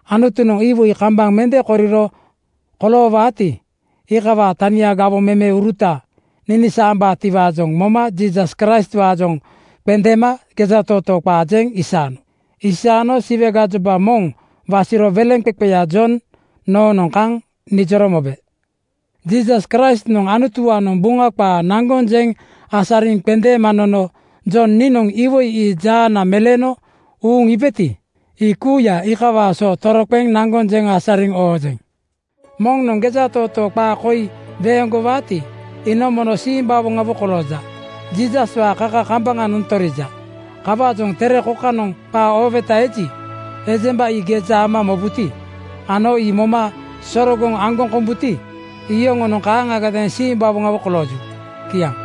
Anutunoŋ iwoi kambaŋ mende koriro koloowaati, iikawaa tania gawoŋ memeuruta ninisaambaatiwaajoŋ moma Jiisas Kraistwaajoŋ qendeema gejatootoo qaa jeŋ isaano. Aisano Siwe gajoba moŋ wasiro weleŋqeqeya Jon noonoŋ kaŋ nijoro mobe. Jiisas Kraistnoŋ Anutuwaanoŋ Buŋa qaa naŋgoŋ jeŋ asariŋ qendeema nono Jon niinoŋ iwoi ii jaana meleeno uuŋ iibeti, ii kuuya iikawaa so toroqeŋ naŋgoŋ jeŋ asariŋ oojeŋ. Moŋnoŋ gejatootoo qaa koi weeŋgowaati, iinoŋ mono simbawoŋawo kolooja. Jiisaswaa kaka kambaŋanoŋ torija. Kawaajoŋ tere kokanoŋ qaa ooweta eji, ejemba ii geja ama mobuti, ano ii moma sorogoŋ aŋgoŋ kombuti, iyoŋonoŋ kaaŋagadeeŋ simbawoŋawo kolooju. Kiaŋ.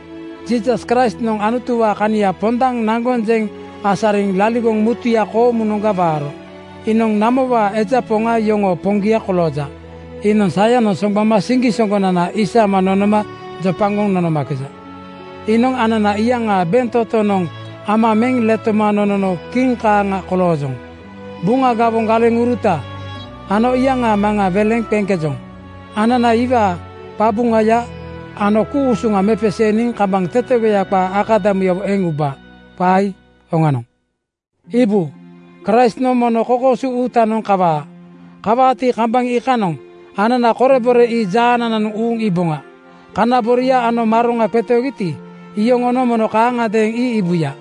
Jiisas Kraistnoŋ Anutuwaa kania pondaŋ naŋgoŋ jeŋ asariŋ laligoŋ mutuya koomunoŋga waaro. Iinoŋ namowaa eja poŋ yoŋoo Poŋgia kolooja. Iinoŋ sayanoŋ soŋgbama siŋgisoŋgonananoŋga isama nonoma jopagoŋ nonomakeja. Iinoŋ anana iyaŋaa bentotoŋanoŋ ama meŋ letoma nonono kiŋ kaaŋa koloojoŋ. Buŋa gawoŋ galeŋuruta (priist) ano iyaŋaa Maŋa Anutuwaa weleŋ qeŋkejoŋ. Anana iwaa qabuŋaya ano ku-usuŋa mepeseeniŋ kambaŋ tetegoya qaa akadamuyawo eŋ ubaa. Qaa ii oŋanoŋ. Iibu, Kraistnoŋ mono kokoosu uutanoŋ kawaa! Kawaati, kambaŋ iikanoŋ anana korebore ii jaanananoŋ uuŋ iiboŋa. Kana boria ano maroŋa qetoogiti, iyoŋonoŋ mono kaaŋagadeeŋ ii iibuya.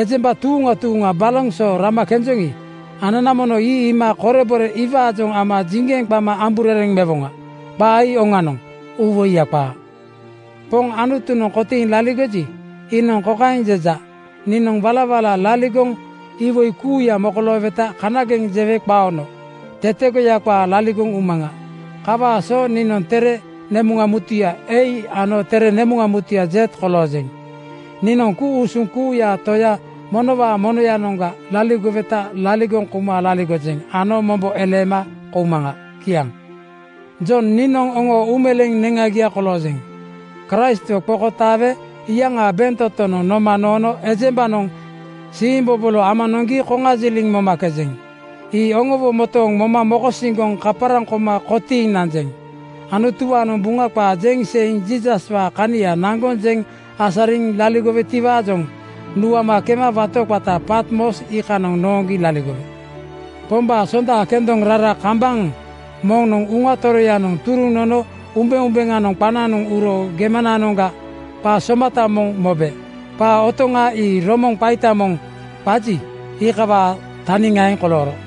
Ejemba tuuŋa tuuŋa baloŋ so rama kenjoŋi, anana mono ii iima korebore iwaajoŋ ama jiŋgeŋ qama amburereŋ mewoŋa. Qaa ii oŋanoŋ, uuwoiya qaa. Poŋ Anutu kotiiŋ laligoji, iinoŋ kokaeŋ jeja, “Niinoŋ walawala laligoŋ (iwoi kuuya mokolooweta kanageŋ jewe qaono) tetegoya qaa laligoŋ umaŋa. Kawaa so niinoŋ tere nemuŋa mutuya A ano tere nemuŋa konoga Z koloojeŋ.” Niinoŋ ku-usuŋ kuuyaa Toya monowaa monoyanoŋga laligoweta laligoŋ kouma laligojeŋ ano mombo eleema koumaŋa. Kiaŋ. Jon niinoŋ oŋoo uumeleeŋ neŋagia koloojeŋ. Kraistwo qokotaawe iyaŋaa bentotonoŋ noma noono ejembanoŋ siimbobolo ama noŋgi koŋajiliŋ momakejeŋ. Ii oŋowo motooŋ moma mokosiŋgoŋ kaparaŋ koma kotiiŋ nanjeŋ. Anutuwaanoŋ Buŋa qaa jeŋ seiŋ Jiisaswaa kania naŋgoŋ jeŋ asariŋ laligowetiwaajoŋ nuama kema wato qata Patmos iikanoŋ nooŋgi laligowe. Pombaa sonda kendoŋ rara kambaŋ moŋnoŋ Uŋa Toroyanoŋ turuŋ nono umbeumbeŋanoŋ qananoŋ uro gemananoŋga qa somata moŋ mobe. Qa otoŋa ii romoŋ qaita moŋ (biugel) qaji, iikawaa taniŋaeŋ kolooro.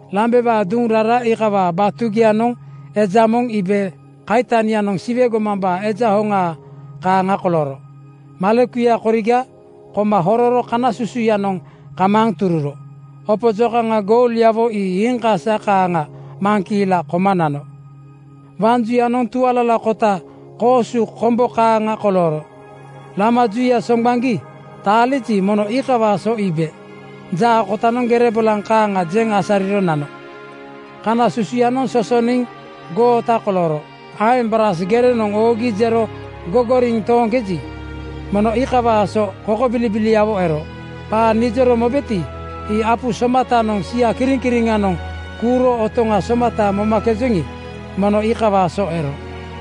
Lambewaa duŋ rara iikawaa batugianoŋ eja moŋ iibe kaitanianoŋ Siwe gomambaa Eja hoŋaa kaaŋa kolooro. Malekuya koriga koma hororo kana susuyanoŋ kamaaŋ tururo. Opo jokaŋa goulyawo ii iiŋ kasa kaaŋa maŋkiila koma nano. Waŋ juyanoŋ tualalakota koosu kombo (snow) kaaŋa kolooro. Lama juya soŋgbaŋgi taaliji, mono iikawaa so iibe. Jaa kotanoŋ gere bolaŋ kaaŋa jeŋ asariro nano. Kana susuyanoŋ sosoniŋ goota kolooro. Aeŋ braas gerenoŋ oogi jero gogoriŋ tooŋkeji, mono iikawaa so kokobilibiliawo ero. Qaa nijoro mobeti, ii apu soma-tanoŋ sia kiriŋkiriŋanoŋ kuuro otoŋa somata momakejoŋi, mono iikawaa so ero.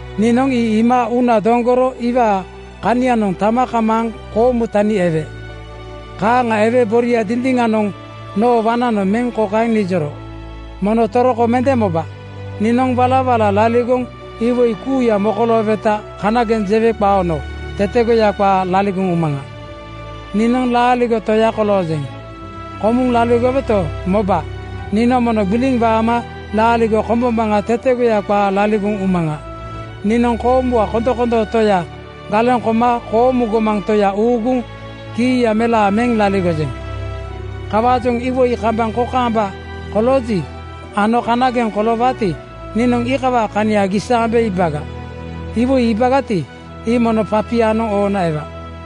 Niinoŋ ii iima uuna doŋgoro iwaa kanianoŋ tama kamaaŋ koomu tani ewe. Kaaŋa ewe boria dindiŋanoŋ noo waŋnanoŋ meŋ kokaeŋ nijoro, “Mono toroko mende moba! Niinoŋ walawala laligoŋ (iwoi kuuya mokolooweta kanageŋ jewe qaono) tetegoya qaa laligoŋ umaŋa. “Niinoŋ laaligo Toya koloojeŋ. Komuŋ laligoweto, moba, niinoŋ mono gbiliŋ waama laaligo kombombaŋa tetegoya qaa laligoŋ umaŋa. Niinoŋ koomuwaa kondomondoo Toya galeŋ koma koomu gomaŋ Toya uuguŋ kiiya melaa meŋ laligojeŋ. Kawaajoŋ iwoi kambaŋ kokaamba kolooji ano kanageŋanoŋ koloowaati, niinoŋ iikawaa kania gisaambe iibaga. Iwoi iibagati, ii mono papianoŋ oona ewa.